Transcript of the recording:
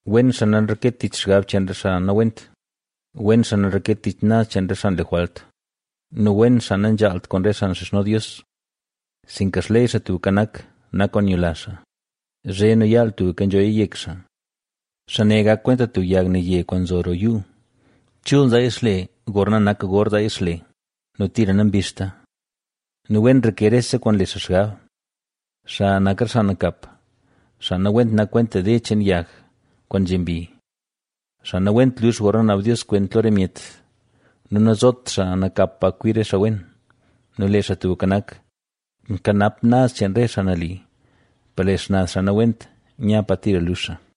Wen xaa nanreket tich xgab cheen re xaa nawent, wen xaa nanreket tich naz cheen re xaa nle jwalt, nu wen xaa nanzhaalt kwaan re xaa nxizhno Dios. Sinka xley Xaa Tubka Nak, nak kwaan nyula xaa, zhe nu yaal tubka nzhoya yek xaa. Xaa ne gak kwenta tub yag naye kwaan nzo roo yuu; chul nzaaya xle gorna nak gor zaaya xle nu tira nabizhta. Nu wen nreke rese kwaan nle xaa xgab. Xa nak re xaa nakap. Xaa nawent nak kwenta de cheen yag, kwaan nzhe mbi. Xaa nawent lux gorna naab Dios kwent lo re myet nu nazot xaa nakap pa kwi re xaa wen. Nu lee Xaa Tubka Nak, nkanap naz cheen re xaa nali, per lee xnaz xaa nawent nya pa tira lux xaa.